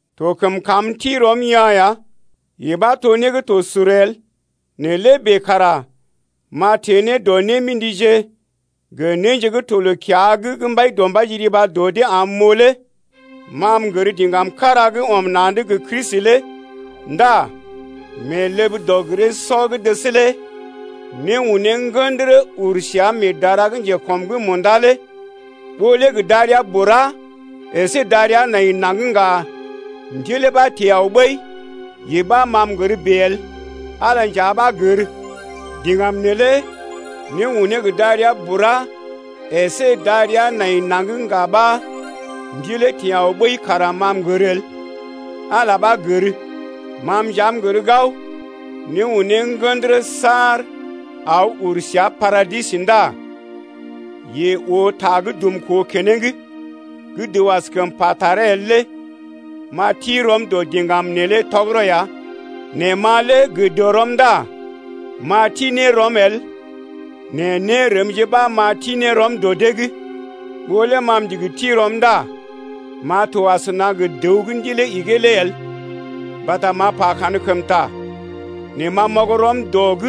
To kəm kam m’ti rɔm yaa̰ ya. Yee ɓa to né gə́ to sur el. Nɛ lé bèe kara m’a teḛ ne dɔ némḭdije gə néje gə́ to loo-kiya’g gə́ Mbaidɔmbaije riba dɔ dee am m’oo lé. Ma m’gər diŋgam kára gə́ ɔm na̰’d gə Kristi lé ndá mee ləb dɔg-giree-sɔ gə́ dəs lé né unee ŋgə̰dərə uru səa mee dara gə́ njekɔm’g munda lé. Ɓó lé gə darəa bura əsé darəa nai naŋg ŋga ndilee ɓa teḛ aw ɓəi, yee ɓa, ma m’gər bèe el, Ala nja ɓa gər. Diŋgam neelé né unee gə darəa bura əsé darəa nai naŋg ŋga ɓa ndilee teḛ aw ɓəi kara ma m’gər el, Ala ɓa gər. Ma nja m’gər gao, né unee ŋgə̰dərə saar aw uru səa paradis ndá yeḛ oo ta gə́ dumkoo keneŋ gə́ dəw askəm pa taree el lé. M’a ti rɔm dɔ diŋgam neelé tɔgərɔ ya nɛ ma lé gə dɔrɔm ndá m’a ti ne rɔm el nɛ nérəmje ɓa m’a ti ne rɔm dɔ dee’g ɓa. Ɓó lé ma m’ndigi ti rɔm ndá m’a to asəna gə dəw gə́ ndilee igee lé el mbata m’a pa kankəmta. Nɛ ma m’ɔg rɔm dɔ’g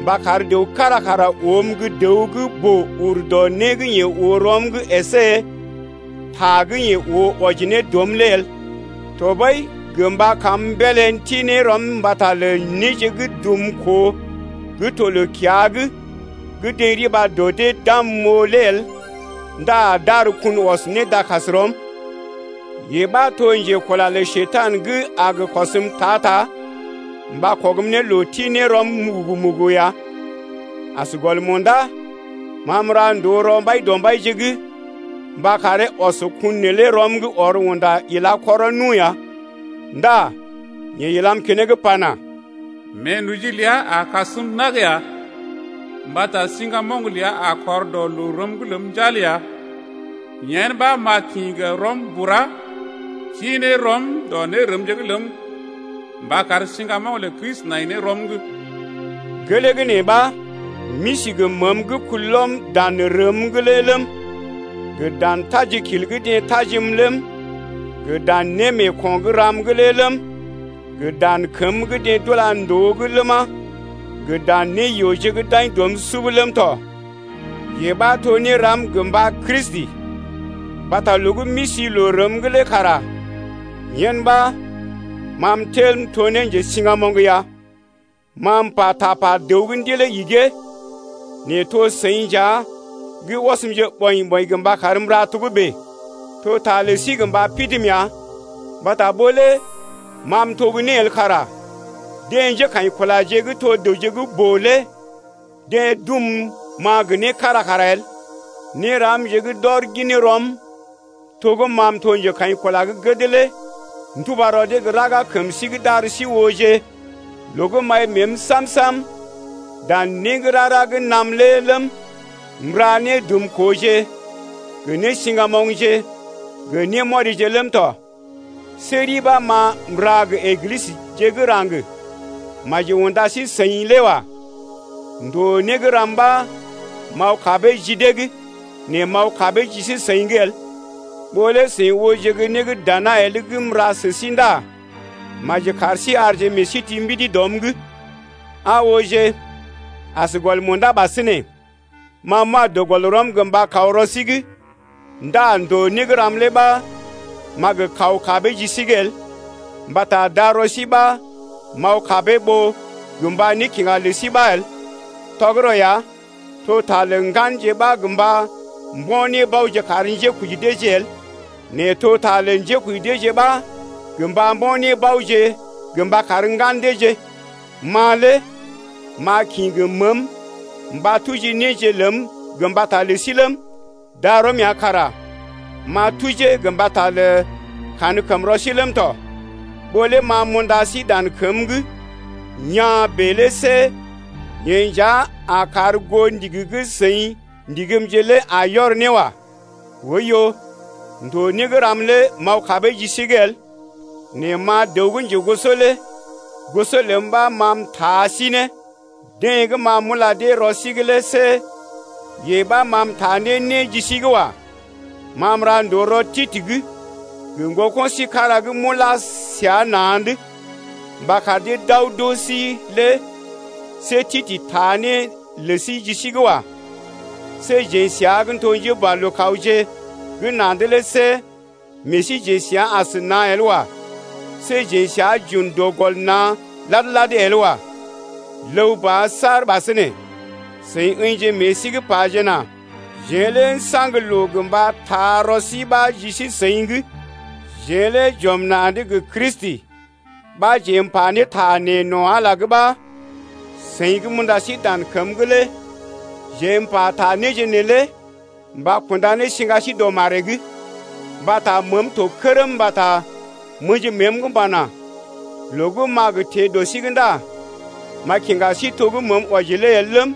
mba kar dəw kára kara oom gə́ dəw gə́ boo ur dɔ né gə́ yeḛ oo rɔm’g əsé ta gə́ yeḛ oo wɔji ne dɔm’g lé el. Tɔɓəi gə mba kam m’beelé m’ti ne rɔm mbata lə néje gə́ dumkoo gə́ to loo-kiya’g gə́ deḛ riba dɔ dee’g d’am m’oo lé el ndá d’ar kun ɔs ne dakasrɔm, yee ɓa to njekula lə Njekurai gə a gə kɔsm ta-ta mba kɔgm ne loo ti ne rɔm mugugu-mugugu ya. As gɔl munda, ma m’ra ndòo rɔ Mbaidɔmbaije’g mba karee ɔs kun neelé rɔm’g ɔr unda ila kɔrɔ nu ya. Ndá yeḛ ilam keneŋ pana: Meenoji ləa a kasm nag ya, mbata siŋgamoŋ ləa a kɔr dɔ loo rəm’g ləm njal ya. Yen ɓa m’a kḭ gə́ rɔm ti ne rɔm dɔ nérəmje’g ləm mba kar siŋgamoŋ lə Kristi nai ne rɔm’g. Gelee gə́ nee ɓa, m’isi gə məəm gə́ kulɔm dan rəm’g lé ləm, gə dan tajikil gə́ deḛ tajim ləm, gə dan némeeko̰ gə́ ram’g lé ləm, gə dan kəm gə́ deḛ d’ula ndòo’g ləma, gə dan néyooje gə́ d’aḭ dɔm sub ləm tɔ, yee ɓa to néram gə mba Kristi, mbata loo gə́ m’isi loo rəm’g lé kara yen ɓa, ma m’tel m’to ne njesiŋgamoŋ ya. Ma m’pa tapa dəw gə́ ndilee igee. Nɛ to seḭ nja gə́ ɔsmje ɓɔḭ-ɓɔḭ mba karm m’ra togə́bè. To ta lə sí gə mba pidim ya mbata ɓó lé ma m’to gə́ né el kara deḛ njékaḭkulaje gə́ to dəwje gə́ boo lé deḛ dum ma gə né kára kara el. Néramje gə́ d’ɔr gin rɔm to gə́ ma m’to njekaḭkula gə́ gəd lé nduba rɔ dee gə́ raga kəm sí’g d’ar sí ooje loo gə́ m’ai məəm sam-sam dan né gə́ rara gə́ naam lé ləm, m’ra nédumkooje gə nésiŋgamoŋje, gə némɔrije ləm tɔ. See ri ɓa ma m’ra gə Eglisəje gə́ raŋg maji unda sí-seḭ lé wa. Ndoo né gə́ ram ɓa m’aw kabee ji dee’g nɛ m’aw kabee ji sí-seḭ’g el. Ɓó lé seḭ ooje gə́ né gə́ dana el gə́ m’ra sə sí ndá maji kar sí arje meḛ sí ti mbidi dɔm’g. Aa ooje, as gɔl munda ɓasinè, ma m’wa dɔ gɔl rɔm gə mba kaw rɔ sí’g ndá ndòo né gə́ ram lé ɓa m’a gə kaw kabee ji sí’g el, mbata darɔ sí ɓa m’aw kabee ɓó gə mba nékiŋga lə sí ɓa el. Tɔgərɔ ya, to ta lə ŋganje ɓa gə mba mbo̰ nébaoje kar njékoji deeje el, nɛ to ta lə njékoji deeje ɓa gə mba mbo̰ nébaoje gə mba kar ŋgan deeje. Ma lé m’a kḭ gə məəm mba tuji néje ləm gə mbata lə sí ləm, darɔm ya kara m’a tujee gə mbata lə kankəmrɔ sí ləm tɔ. Ɓó lé ma m’unda sí dan kəm’g yaa̰ bèe lé see yee nja a kar goo ndigi gə́ seḭ ndigimje lé a yɔr ne wa. Oiyo, ndòo né gə́ ram lé m’aw kabee ji sí’g el, nɛ ma dəw gə́ njegoso lé goso ləm ɓa ma m’taa sí ne!... Deḛ gə́ ma m’ula dee rɔ sí’g lé see yee ɓa ma m’taa ne né ɓa ji sí’g wa. Ma m’ra ndòo rɔ Titə’g gə ŋgoko̰ sí kára gə́ m’ulá səa na̰’d mba kar dee d’aw d’oo sí lé. See Titə taa né lə sí ji sí’g wa. See jeḛ səa gə́ n’to njéboalookawje gə́ na̰’d lé see meḛ síjeḛ səa as na̰ el wa. See jeḛ səa j’un dɔ gɔl na̰ lad-lad el wa. Ləw ba saar ɓasinè, seḭ ə̰jije meḛ sí’g pajena: Jeḛ lé n’saŋg loo gə mba taa rɔ sí ɓa ji sí-seḭ’g. Jeḛ lé j’ɔm na̰’d gə Kristi ɓa jeḛ m’pata nee no̰ Ala’g ɓa. Seḭ gə́ m’unda sí dan kəm’g lé jeḛ m’pata néje neelé mba kunda ne siŋga sí dɔ maree’g. Mbata məəm to kərm mbata m’ə̰ji məəm’g m’pana: Loo gə́ m’a gə teḛ dɔ sí’g ndá m’a kiŋga sí to gə́ məəm wɔji lé el ləm,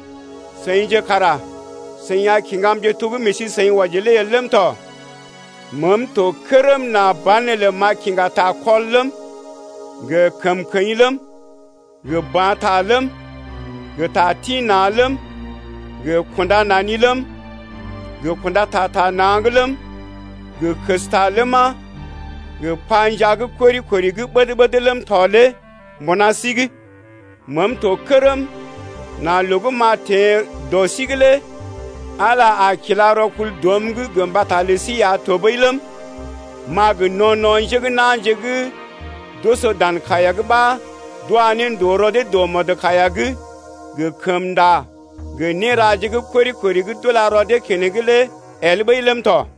seḭje kara seḭ a kiŋgamje to gə́ meḛ sí-seḭ wɔji lé el ləm tɔ. Meem to kərm nà banelə m’a kiŋga takɔl ləm, gə kəmkəḭ ləm, gə ba̰ ta ləm, gə ta tḭ-na̰ ləm, gə kunda nani ləm, gə kunda ta ta na̰’g ləm, gə kəsta ləma, gə panjaa gə́ kori-kori gə́ ɓəd-ɓəd ləm tɔ lé mbuna sí’g. Meem to kərm nà loo gə́ m’a teḛ dɔ sí’g lé Ala a kila rɔkul dɔm’g gə mbata lə sí ya tɔɓəi ləm, m’a gə no̰-no̰ njé gə́ na̰je gə́ d’oso dan kaiya’g ɓa d’wa ne ndòo rɔ dee dɔ mɔdkaiya’g gə kəmnda gə néraje gə́ kori-kori gə́ d’ula rɔ dee keneŋ lé el ɓəi ləm tɔ.